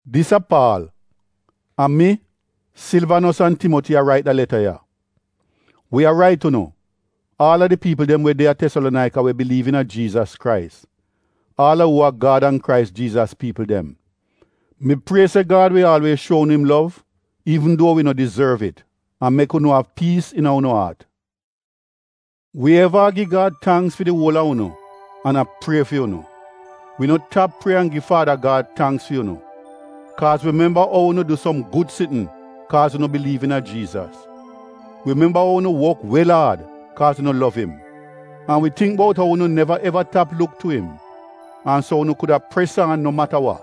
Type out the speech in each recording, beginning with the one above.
Dis a Paal. A mi, Silvanos an Timoti a rait da leta ya. Wi a rait unu — aal a di piipl dem we de a Tesalonaika we biliiv iina Jiizas Krais, aal a uu a Gad an Krais Jiizas piipl dem: Mi prie se Gad wi aalwiez shuo unu im lov iivn duo wi no dizorv it an mek unu av piis iina unu aat. Wi eva a gi Gad tangks fi di uol a unu an a prie fi unu. Wi no tap prie an gi Faada Gad tangks fi unu kaaz wi memba ou unu du som gud sitn kaaz unu biliiv iina Jiizas. Wi memba ou unu wok wel aad kaaz unu lov im; an wi tingk bout ou unu neva eva tap luk tu im, an so unu kuda pres aan no mata wa.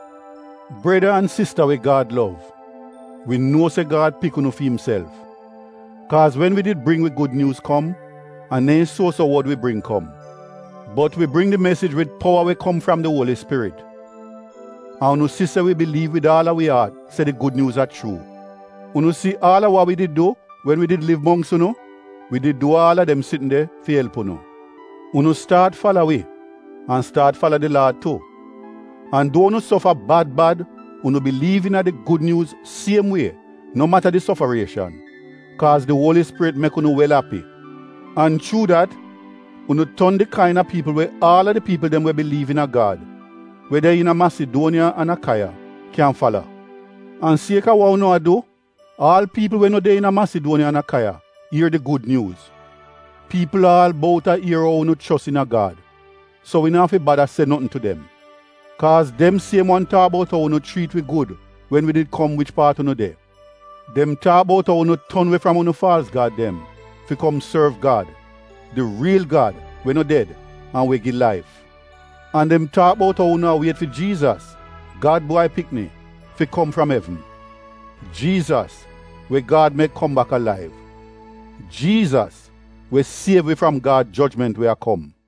Breda an sista we Gad lov, wi nuo se Gad pik unu fi imself. Kaaz wen wi did bring wi Gud Nyuuz kom, a neehn suo-so wod wi bring kom, bot wi bring di mesij wid powa we kom fram di Uoli Spirit. An unu si se wi biliiv wid aal a wi aat se di Gud Nyuuz a chuu. Unu si aal a wa wi did du wen wi did liv mongks unu? Wi did du aal a dem sitn de fi elp unu. Unu staat fala wi — an staat fala di Laad tu. An duo unu sofa bad bad unu biliiv iina di Gud Nyuuz siem wie no mata di sofarieshan, kaaz di Uoli Spirit mek unu wel api. An chuu dat, unu ton di kain-a piipl we aal a di piipl dem we biliiv iina Gad, we de iina Masiduoniya an Akaiya, kyan fala. An siek-a wa unu a du, aal piipl we no de iina Masiduoniya an Akaiya ier di Gud Nyuuz. Piipl aal bout a ier ou unu chos iina Gad — so wi no afi bada se notn tu dem, kaaz dem siem wan taak bout ou unu chriit wi gud wen wi did kom wich paat unu de. Dem taak bout ou unu ton we fram unu faalz gad dem, fi kom sorv Gad — di riil Gad we no ded an we gi laif. An dem taak bout ou unu a wiet fi Jiizas, Gad Bwai Pikni, fi kom fram evn. Jiizas, we Gad mek kom bak alaiv. Jiizas, we siev wi fram Gad jojment we a kom.